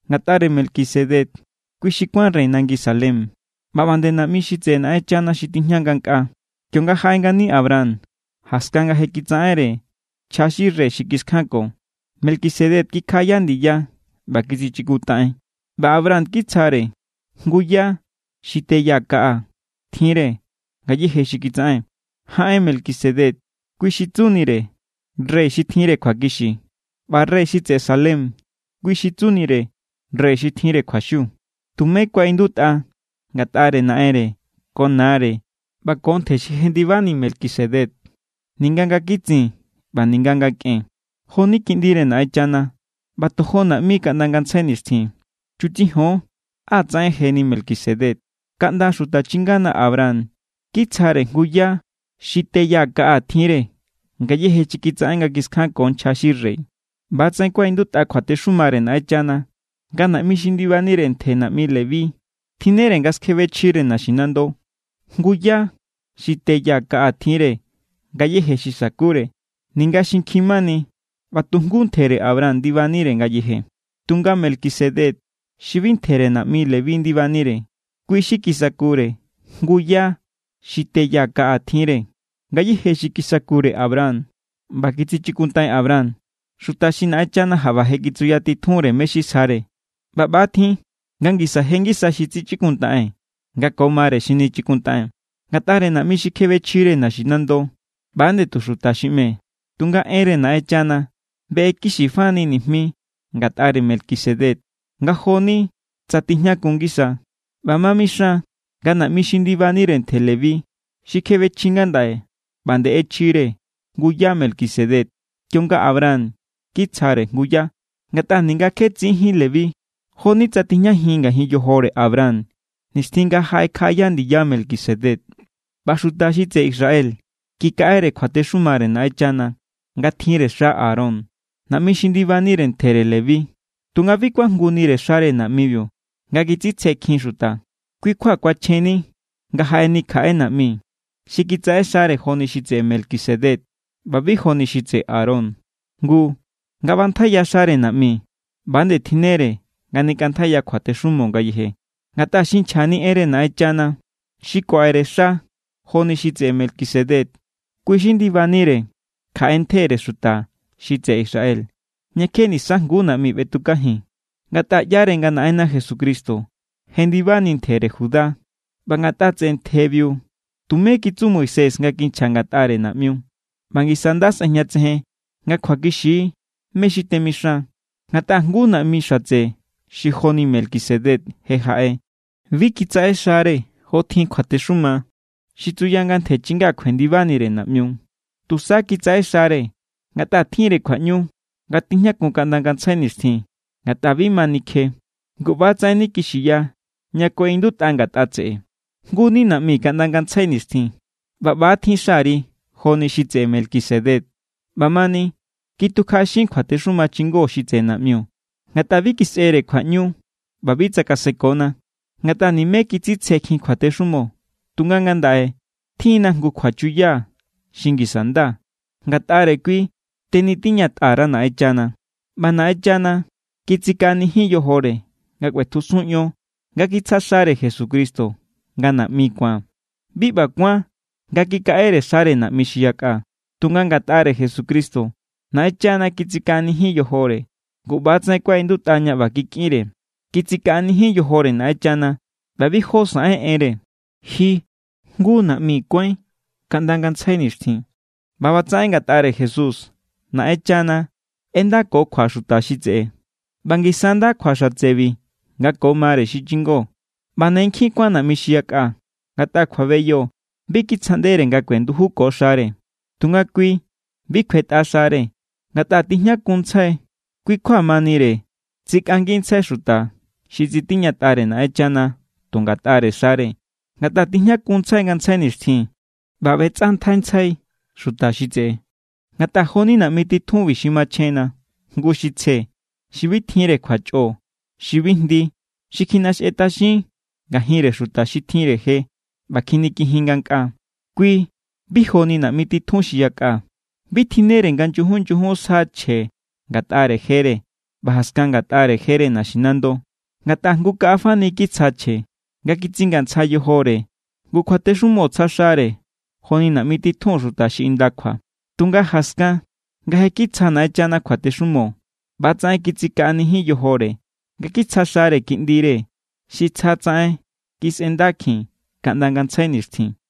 Ngatꞌare Melquisedec, kui xi kuán rey nangi Salem ꞌba ꞌba nde naꞌmi xi tseꞌe Naꞌenchana xi tijña ngankꞌaa. Kionga jaꞌe ngani Abraham jaskan nga kitsaꞌenre nchja xi rey xi kiskjanko, Melquisedec kikjaꞌaya ndiya ꞌba kitsichikuntaꞌen. ꞌBa Abraham kitsjare jngu yá xi te ya kaꞌa tjinre ngayéje xi kitsaꞌen. Jaꞌen Melquisedec, kui xi tsunire “rey xi tjinre kjuakixi.” ꞌBa rey xi tseꞌe Salem, kui xi tsunire “rey xi tjinre kjuaxiu.” Tumé kuaꞌindutꞌa ngatꞌare naꞌenre ko nare ꞌba ko ntje xi jendibani Melquisedec, ninga nga kitsin ꞌba ninga nga kꞌen. Jo=ni Kiꞌndire Naꞌenchana ꞌba tojo naꞌmi kaꞌnda ngantsjai nixtjin. Chutsijon á tsaꞌen jeni Melquisedec. Kaꞌnda xuta chingana Abraham kitsjare jngu yá xi te ya kaꞌa tjinre ngayéje xi kitsaꞌen nga kiskjanko nchja xi rey. ꞌBa=tsaꞌen kuaꞌindutꞌa kjuatexumare Naꞌenchana nga naꞌmi xi ndibanire ntjere naꞌmi Leví tjinnere nga skjebe chjire naxinando jngu yá xi te ya kaꞌa tjinre ngayéje xi sakure, ninga xinkjin mani ꞌba tu jngu ntjere Abraham ndibanire ngayeje. Tunga Melquisedec xi bi ntjere naꞌmi Leví ndibanire, kui xi kisakure jngu yá xi te ya kaꞌa tjinre ngayéje xi kisakure Abraham ꞌba kitsichikuntaꞌen Abraham, xuta xi Naꞌenchana jaꞌba je kitsuyatitjunre mé= xi sjare. ꞌBa ꞌba= tjin nga ngisa je ngisa xi tsichikuntaꞌen nga ko mare xi nichikuntaꞌen. Ngatꞌare naꞌmi xi kjebechjire naxinando, ꞌba=nde tu xuta xi ꞌme. Tunga enre Naꞌenchana beꞌekixifani nijmi ngatꞌare Melquisedec nga jo=ni tsa tijñakun ngisa. ꞌBa ma mixan nga naꞌmi xi ndibanire ntjere Leví xi kjebechji ngandaꞌe ꞌba nde ꞌechjire jngu yá Melquisedec kionga Abraham kitsjare jngu yá. Ngatꞌa ninga kje tsiín Leví, jo=ni tsa tijñajin ngajin yojore Abraham nixtjin nga jaꞌekjaꞌaya ndiya Melquisedec. ꞌBa xuta xi tseꞌe Israel kikaꞌere kjuatexumare Naꞌenchana nga tjinre xa Aarón, naꞌmi xi ndibanire ntjere Leví. Tunga bi kuajngunire xare naꞌmibiu nga kitsitsjekjin xuta. Kui= kjua kuachjenni nga jaꞌeni kjaꞌe naꞌmi xi kitsaꞌexare joni xi tseꞌe Melquisedec ꞌba bi joni xi tseꞌe Aarón. Ngu, nga ꞌbantjaiya xare naꞌmi, ꞌba=nde tjinnere nga nikꞌantjaiya kjuatexumo ngayeje. Ngatꞌa xi nchjani enre Naꞌenchana, xi kuaꞌere xa joni xi tseꞌe Melquisedec, kui xi ndibanire kjaꞌe ntjere xuta xi tseꞌe Israel, ña kje nisajnguú naꞌmi ꞌbetukajin. Ngatꞌa ꞌyare nga Naꞌenna Jesucristo jendibani ntjere Judá, ꞌba ngatꞌa tseꞌe ntjebiu tumé kitsu Moisés nga kinchja ngatꞌare naꞌmiu. ꞌBa ngisa= nda sꞌejñatsejen nga kjuakixi= mé= xi temixan, ngatꞌa jngu naꞌmi xatse xi joni Melquisedec je jaꞌe. Bi kitsaꞌexare jotjin kjuatexuma xi tsuya nga ntje chinga kjuendibanire naꞌmiu. Tusa kitsaꞌexare ngatꞌa tjinre kjuaꞌñu nga tijñakun kaꞌnda ngantsjai nixtjin. Ngatꞌa bi ma nikje. Ngu ꞌba=tsaꞌen nikixiya ña kuaꞌindutꞌa ngatꞌa tseꞌe: Jngu= ni naꞌmi kaꞌnda ngantsjai nixtjin. ꞌBa ꞌbatjin xari joni xi tseꞌe Melquisedec. ꞌBamani, kitukjaꞌaxin kjuatexuma chingó xi tseꞌe naꞌmiu, ngatꞌa bi kisꞌere kjuaꞌñu ꞌba bi tsakasekona. Ngatꞌa nimé kitsitsjekjin kjuatexumo. Tunga ngandaꞌe tjinna jngu kjuachuya xi ngisa= nda. Ngatꞌare kui tenitiñatꞌa_ra Naꞌenchana. ꞌBa Naꞌenchana kitsikaꞌanijin yojore nga kꞌuetjusun ion nga kitsja xare Jesucristo nga naꞌmi ku̱an. Bi ꞌba kuán nga kikaꞌe xare naꞌmi xi yakꞌa. Tunga ngatꞌare Jesucristo, Naꞌenchana kitsikaꞌanijin yojore. Ngu ꞌba=tsaꞌen kuaꞌindutꞌa ña ꞌba kikꞌinre: Kitsikaꞌanijin yojore Naꞌenchana ꞌba bi jó saꞌen enre. Ji jngu naꞌmi kuáin kaꞌnda ngantsjai nixtjin. ꞌBa ꞌbatsaꞌen ngatꞌare Jesús Naꞌenchana ꞌendakokjua xuta xi tseꞌe, ꞌba ngisa= nda kjua xatsebi nga ko mare xi chingo. ꞌBa ne nkjin kuán naꞌmi xi yakꞌa, ngatꞌa kjuabeyo bi kitsjaꞌndere nga kuendujuko xare. Tunga kui, bi kjuetꞌa xare ngatꞌa tijñakunntsjai. Kui kjua manire tsikꞌangintsjai xuta xi tsitiñatꞌare Naꞌenchana tu ngatꞌare xare, ngatꞌa tijñakunntsjai ngantsjai nixtjin ꞌba ꞌbetsꞌantjaintsjai xuta xi tseꞌe. Ngatꞌa jo=ni naꞌmi titjunbi xi machjenna, jngu xi tsje, xi bi tjinre kjuachꞌo, xi bi jndi, xi kjiꞌnaxjetꞌaxin ngajinre xuta xi tjinre je ꞌba kjinikijin ngankꞌaa. Kui bi joni naꞌmi titjun xi yakꞌa. Bi tjinnere nga nyujun nyujun sja chje ngatꞌare jere ꞌba jaskan ngatꞌare jere naxinando. Ngatꞌa jngu kaꞌa fani kitsja chje, nga kitsingantsja yojore. Ngu kjuatexumo tsja xare joni naꞌmi titjun xuta xi indakjua. Tunga jaskan nga je kitsja Naꞌenchana kjuatexumo, ꞌba=tsaꞌen kitsikaꞌanijin yojore nga kitsja xare Kiꞌndire xi tsjatsaꞌen kisꞌendakjin kaꞌnda ngantsjai nixtjin.